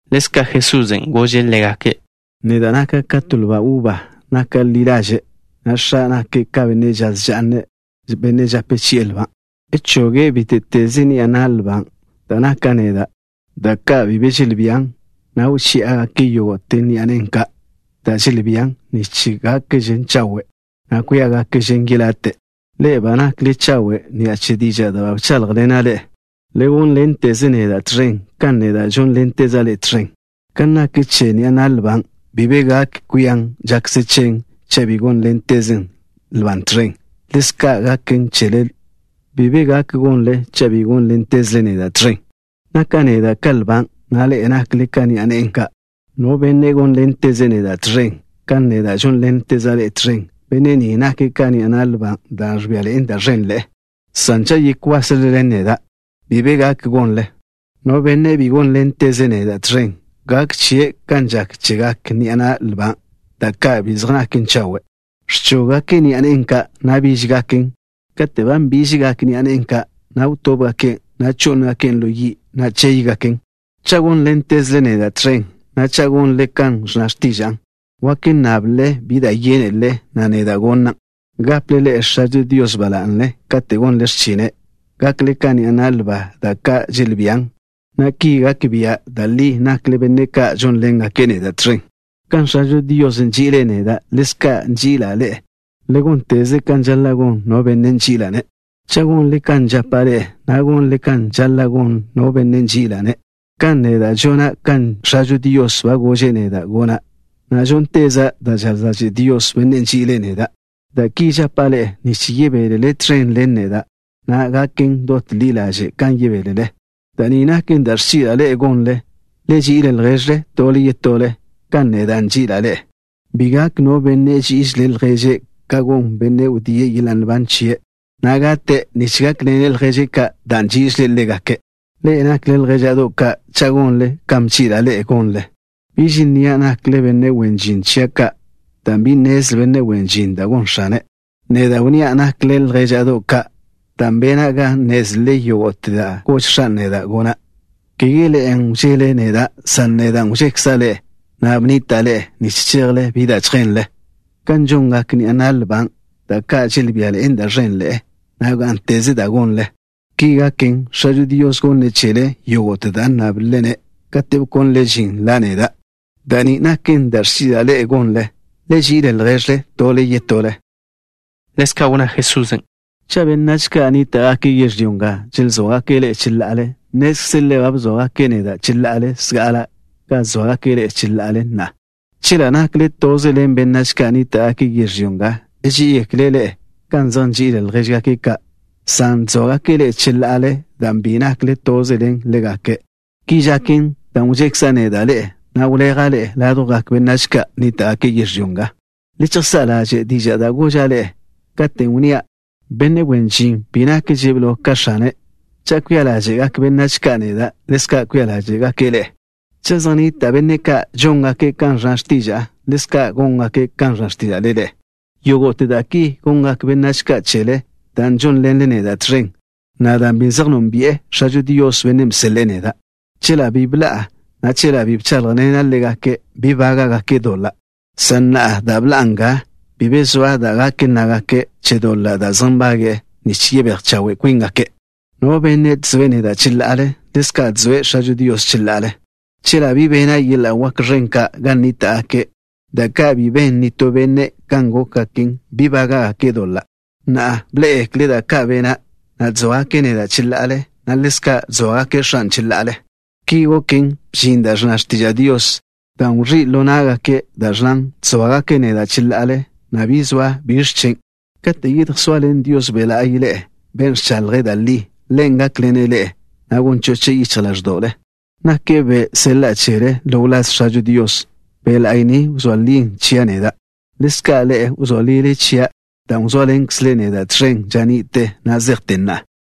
Ḻezka' Jesusen' gože' ḻégake': —Naka' neda' ka to lba uba da' naken ḻi ḻaže', na' X̱a' nake' ka benne' žaz ža'n, benne' žape chi'e lban'. Choge' bíte'teze ni'a na' lban', dan' naka' neda', da' ka' bi be želbían, na' wchi'e yógo'te ni'a nen' ka', da' želbían, nich gákgaken chawe', na' kwíagaken yelate'. Ḻe'e ba nakle chawe' ni'a che dižan' da' ba bcháḻjḻena' ḻe'e. Le gónḻenteze neda' tẕen, kan neda' žónḻenteza' ḻe'e tẕen. Kan nak che ni'a na' lban', bi be gak kwian žakze chen, cha' bi gónḻentezen lban' tẕen, ḻezka' naken chele, bi be gak gonle cha' bi gónḻentezle neda' tẕen. ’Naka' neda' ka lban', na' ḻe'e nakle ka ni'a nen' ka'. No benne' gónḻenteze' neda' tẕen, kan neda' žónḻenteza' ḻe' tẕen, benne' ni nake' ka ni'a na' lban' dan' ẕbian da' ẕenḻe'e, dan' cha' yekwasle ḻen neda', bi be gak gonle. No benne' bi gónḻenteze' neda' tẕen, gak chie' kan žak chegak ni'a na' lban', da' ka' bi zej naken chawe', Ẕchóggake' ni'a nen' ka', na' bížgaken. Katen' ba nbižgak ni'a nen' ka', na' wtóbgaken', na' chó'ngaken' ḻo yi', na' chéygaken. ’Cha' gónḻentezle neda' tẕen, na' cha' gonle kan ẕnna x̱tiža'a, wake nnable bi da' yénelele, na' neda' gonan'. Gaple ḻe'e X̱ažo Dios ba la'ne katen' gonle x̱chine', na' gakle ka ni'a na' lban', da' ka' želbían, na' ki gak bia' da' li nakle benne' ka' žónḻengake' neda' tẕen. Kan X̱ažo Dios nži'ile' neda', ḻezka' nži'ila' ḻe'e. Le gónteze kan žaḻa' gon no benne' nži'ila'-ne'. Cha' gonle kan žapa' ḻe'e, gonle kan žaḻa' gon no benne' nži'ila'-ne', kan neda' žona' kan X̱ažo Dios ba gože' neda' gona', na' žónteza' da' žaz ḻaže' Dios, Bennen' nži'ile' neda'. ’Da' ki žapa' ḻe'e nich yebélele tẕen ḻen neda', na' gaken dot ḻi ḻaže' kan yebélele. Da' ni naken da' ẕchi'la' ḻe'e gonle: le ži'il lježle tole yetole, kan neda' nži'ila' ḻe'e. Bi gak no benne' ží'ižele' lježe' ka gon bennen' wdíe' yeḻa' nban chie', na' gate' nich gákḻene' lježe' ka' dan' nži'ile' ḻégake'. Ḻe'e nakle ljéža'do' ka' cha' gonle kan bchi'la' ḻe'e gonle. Biž nnia' chele nakle wen žin chia' ka', dan' bi nnezle benne' wen žin da' gon x̱ane'. Neda' wnnía' chele nakle ljéža'do' ka', dan' bena' ga nnézlele yógo'te da' gož X̱a' neda' gona'. Kege ḻe'e wžele neda', san neda' wžekza' ḻe'e, na' bnnita'a ḻe'e nich chejle bi da' chjenle, kan žongak ni'a na' lban', da' ka' želbían da' ẕenḻe'e, na' gá'nteze dan' gonle. Ki gaken, X̱ažo Dios gonne' chele yógo'te da' nnáblele-ne', katen' wkónlele žin la' neda'. Da' ni naken da' ẕchi'la' ḻe'e gonle. Le ži'il lježle tole yetole. Ḻezka' wnná Jesusen': —Cha' benách ka' nníta'gake' yežlyó nga ẕzóagake' ḻe'e cheḻa'ale, nnézlele ba bzóagake' neda' cheḻa'ale zga'ale kan ẕzóagake' ḻe'e cheḻa'ale na'a. Chela' nakle toze ḻen benách ka' nníta'gake' yežlyó nga, ží'igekle' ḻe'e kan zej nži'ile' ljéžgake' ka', san ẕzóagake' ḻe'e cheḻa'ale dan' bi nakle toze ḻen ḻégake'. Ki žaken dan' wžekza' neda' ḻe'e, na' wleja' ḻe'e ládjwgak benách ka' nníta'gake' yežlyó nga. Le chejsá' ḻaže' dižan' da' goža' ḻe'e, katen' wnnía': “Benne' wen žin bi nakže' blo ka x̱ane'.” Cha' wžía ḻáže'gak benách ka' neda', ḻezka' kwia ḻáže'gake' ḻe'e. Cha' zej nnita' benne' ka' žóngake' kan ẕnna x̱tiža'a, ḻezka' góngake' kan ẕnna x̱tíža'le ḻe'e. Yógo'te da' ki gongak benách ka' chele dan' žónḻenle neda' tẕen, na' dan' bi zej nónbi'e X̱ažo Dios, Bennen' bseḻe'e neda'. ’Chela' bi bḻa'a, na' chela' bi bcháḻjḻena' ḻégake', bi bága'gake' doḻa', san na'a dan' bḻa'a nga, bi be zoa da' gak nnágake' che doḻa' da' zej nbage'e nich yebéj chawe' kwíngake'. No benne' ẕzoe' neda' cheḻa'ale, ḻezka' ẕzoe' X̱ažo Dios cheḻa'ale. Chela' bi bena' yeḻa' wak ẕen ka' gan nníta'gake', da' ka' bi ben nitó benne' kan gókgaken, bi bága'gake' doḻa'. Na'a, bḻé'egekle' da' ka' bena', na' ẕzóagake' neda' cheḻa'ale, na' ḻezka' ẕzóagake' X̱a' cheḻa'ale. Ki goken, bžin da' ẕnna x̱tiža' Dios, dan' wẕí' ḻo ná'gake', dan' ẕnnan: “Ẕzóagake' neda' cheḻa'ale na' bi zoa biẕ chen'.” ’Kate' yedjsoaḻen Dios Be' La'y ḻe'e, Ben' ẕchaḻje' da' li, Ḻen' gákḻene' ḻe'e, na' gon choche' yichj ḻáẕdo'le. Nake' Ben' seḻa'a chele ḻo wláz X̱ažo Dios. Be' La'y ni wzóa lie' chia' neda'. Ḻezka' ḻe'e wzóa lile chia', dan' wzóaḻenkzle neda' tẕen ža ni'te, na' zejte na'a.